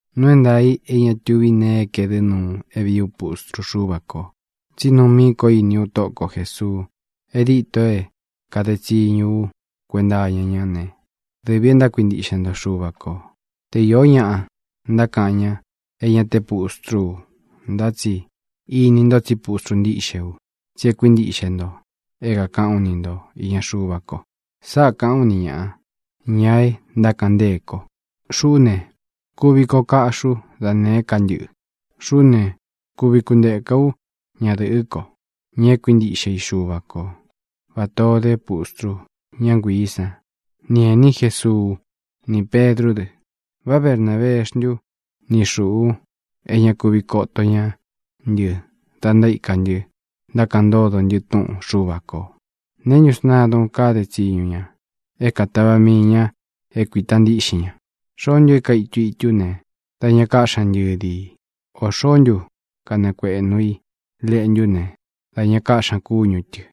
Nuu é ntaā i é ña tuvi nee é kaedɨ́ nuu é vīí u pustru Xúva kō, tsí nuu míī ko íni ú Tóꞌo ko Jēsuu. E díto é kāde tsiñu ú kuenta iña ñá ne, dɨvī é ntákuintiꞌxe nto Xuva kō. Te īo ñaꞌa ntákaꞌan ñá e ña te pustrú u, ntá tsi ini nto tsí pustru ntíꞌxe u, tsí é kuintíꞌxe nto é kākaꞌán u ni ntō iña Xuva ko. Sáꞌā kaꞌán u ni ñāꞌa, ña e ntákaꞌan ntée ko: Xuꞌú ne, kuvi koꞌo kaꞌxi ú da nēé ka ntɨꞌɨ. Xuꞌú ne, kuvi kunteka ú ñadɨ̄ꞌɨ́ ko, ña é kuintiꞌxe i Xuva ko, vatā ó de pustru, ñá nguiī sán, ni ēní Jesuu, ni Pedrú dɨ. ¿Vá Bernābeé xntu ni xūꞌu é ña kuvi koto ñá ntɨ da ntaíka ntɨ ntákaꞌan ntódo ntɨ túꞌun Xuva kō? ¿Neē ntú sntadun kade tsiñu ña é katáva mii ña é kuīta ntiꞌxin ña? ¿Xoó ntu é kaitu i itu ne, da ña kaꞌxi ña ntɨ́di i? ¿Ō xoó ntu kanakueꞌnu i leꞌntu ne, da ña káꞌxi ña kúñu tɨ̄?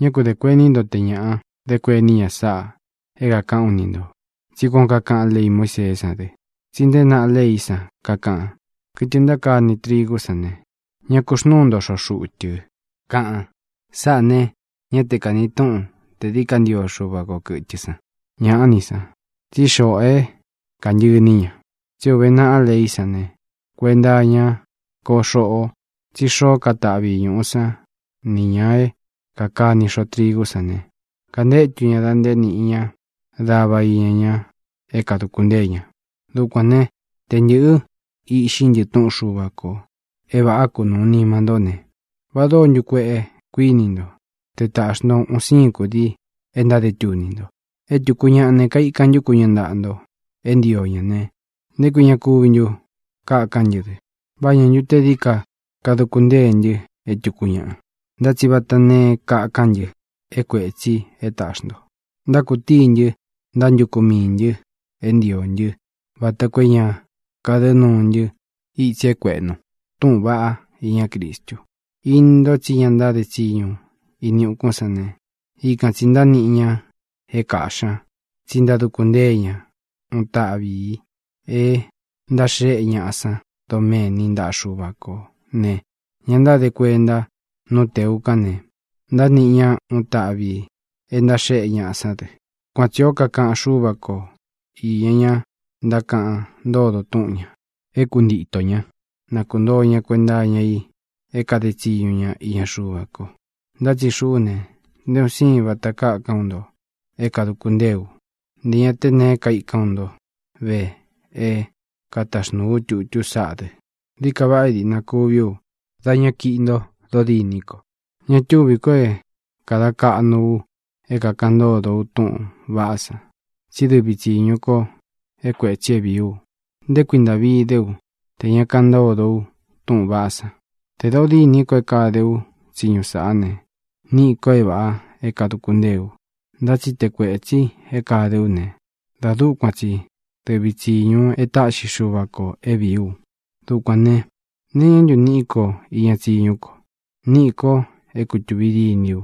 Ñá ku dē kuení nto te ñāꞌa dé kuení ña sáꞌa é kākaꞌán u ni ntō, tsí kuān ó kakaꞌán lei Muíseé san dɨ. Tsí nteé naꞌá leí san, kakaꞌan: “Kɨtɨ ntákani trigú san ne, ñá ku xnūu nto xoꞌo xuꞌu tɨ”, kaꞌan. Sāꞌá ne, ñá te kāni túꞌun tē dií ka ntio Xuva ko kɨ̄tɨ san. ¡Ñāꞌá ni san! tsí xoꞌo é kāntɨꞌɨ iní ña. Tsí é ūve naꞌá leí san ne, kuenta iña ko xoꞌo: Tsí xoo é kataꞌvi i ñūꞌu sán nī ña é kākani xoꞌo trigú san ne, kantétu ña da nté nīꞌi ña dava iña ña é kāduku ntée ña. Dukuān né, tē ntɨꞌɨ iꞌxi ntɨ túꞌun Xuva kō é vāꞌá kunuu nima ntó ne, ¿va dóo ntu kueꞌe, kuíni nto, te taꞌxi nto un siin kudii é ntáde tuni nto? E túku ñaꞌa ne, kaikan ntú ku ña ntaꞌa nto é ntio ña ne, ¿nté kui ña kuvi ntu kakan ntɨ́ dɨ? ¿Vá ña ntu té dií ka kaduku ntée ntɨ é tūku ñaꞌa? Ntá tsi vata neé kakán ntɨ é kuētsi é taꞌxi nto. Ntákutíi ntɨ ntantúku miī ntɨ é ntio ntɨ vata koo é ña kadɨ nuu ntɨ itsi é kuēꞌnu túꞌūn vaꞌá iña Cristu. Ini nto tsí ña ntáde tsiñu ini ukún san ne, ikan tsī ntániꞌi ña é kāꞌxi ña tsí ntáduku ntée ña uun taꞌvi ī é ntáxéꞌe ñaꞌa san doméni ntaꞌa Xuva kō ne, ña ntáde kuenta nú tēu kan ne, ntániꞌi ña uun táꞌvi ī é ntáxéꞌe ñaꞌa sán dɨ. Kuan tsī ó kakaꞌan Xúva ko īña ña ntákaꞌan ntódo túꞌun ñā, é kuntitō ñá na kuntōo ña kuenta iña i é kāde tsiñu ña iña Xuva ko. Ntá tsi xuꞌú ne, nté un sīin vata kákán u nto é kāduku ntée u. Ntē ña te neé kaikán u nto ve é kataxnūu ú tutú saꞌá dɨ. Dií ka vaꞌa é dīꞌna kuví u dá ña kiꞌi nto dodîní ko. Ña túvī ko é kāda kaꞌnu u é kākaꞌan ntódo u túꞌūn vaꞌá san, tsí dɨvi tsīñu ko é kuētsi é vīí u. ¡Nté kui ntāꞌvi dé u tē ña kaꞌan ntódo u túꞌūn vaꞌá san! Tē dodîní ko é kāde ú tsiñu sáꞌa ne, níꞌi ko é vāꞌa é kāduku ntée u. Ntá tsi te kuētsi é kāde ú ne, da dúkuan tsi dɨvi tsīñu e táꞌxi Xuva kō é vīí u. Dukuān ne, ¿nee iñá ntu niꞌí ko iña tsiñu ko? Níꞌī ko é kutūví diní u,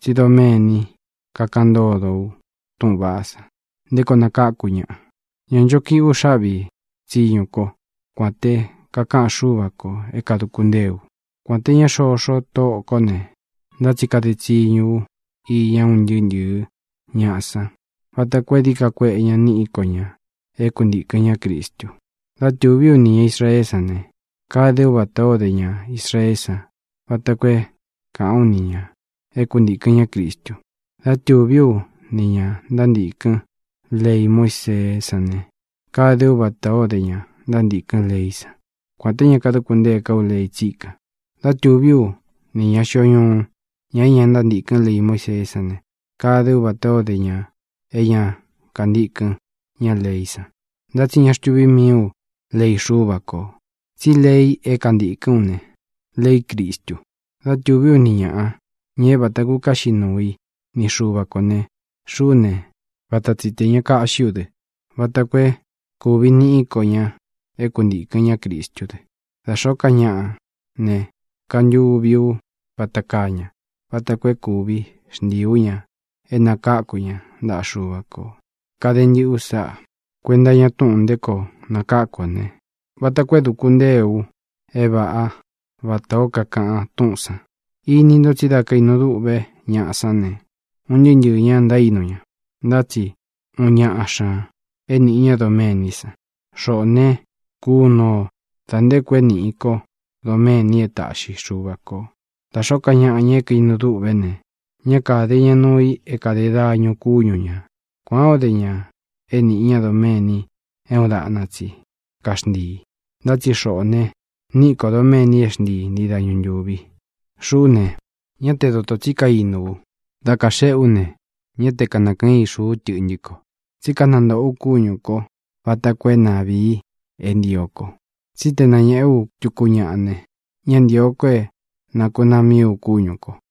tsí doméni kakaꞌan ntódo u túꞌūn vaꞌá san nté koo nakáku ñaꞌa. Ñā ncho kiꞌi ú xáꞌvī tsiñu kó, kuān té kakaꞌan Xúva kō é kāduku ntée u. Kuān té ña xoxo tóꞌō kó ne, ntá tsi kade tsiñu ú iña un ntɨɨ́ ntɨ̄ɨ ñáꞌa san vata koo é dií ka kueꞌe ñaꞌa niꞌi ko ña é kuntīkɨn ñá Cristu. Dá tūví u nī ña Israeé san ne, kade ú vatā ó de ña Israeé san vata koo é kāꞌán u ni ñā é kuntīkɨn ñá Cristu. Dá tūví u ni ñā ntántīkɨn lei Muíseé san ne, kade ú vatā ó de ña ntántīkɨn leí san, kuān té ña kaduku ntée ká u lei tsíkan. Dá tūví u nī ña xio ñuu, ña é ña ntántīkɨn lei Muíseé san ne, kade ú vatā ó de ña é ña kantíkɨn ña leí san. Ntá tsi ña xtuví mii u lei Xúva kō, tsí lei é kantīkɨ́n u ne, leí Cristu. Dá tūví u ni ñāꞌa, ña é vata kukaꞌxi nuu i ni Xuva kō ne, xuꞌú ne, vata tsi tē ña kaꞌxí u dɨ, vata koo é kūvi niꞌí ko ña é kuntīkɨn ñá Cristú dɨ. Da xōó ka ñaꞌa ne, kantuvi ú vata kaa ña vata koo é kuvi xntii ú ña é nakáku ña ntaꞌa Xuva kō. Kade ntɨꞌɨ ú sáꞌā kuenta iña túꞌūn nté koo nakáku ō ne, vata koo é dūku ntée u é vāꞌá vatā ó kakaꞌan túꞌūn san. Ini nto tsí da kainu duꞌve ñaꞌa sán ne, un ntɨɨ́ ntɨɨ̄ ña ntaínu ña, ntá tsi uun ñaꞌa xña é nīꞌi ñá doméni san. Xoꞌō ne, kunu o da nté koo é niꞌi ko doméni é taꞌxi Xuva kō. Da xōó ka ñaꞌa, ña é kaīnu dûꞌvé ne, ñá kāde ña nuu i é kāde dañu kúñu ñā. Kuān ó de ña é niꞌi ña doméni é uun daꞌna tsi kaxntii. Ntá tsi xoꞌō ne, niꞌi ko doméni é xntii ntii dañu ntūvi. Xuꞌú ne, ñá te doto tsi kainu u. Da kaxeꞌe ú ne, ñá te kanakɨꞌɨn ixu ú tɨꞌntɨ́ ko, tsí kanantoꞌō ú kúñū kó vata koo é na vīi é ntio ko. Tsí te ē nañéꞌe u tuku ñáꞌa ne, ñá ntīo ko é nakūnaa mií u kúñū ko.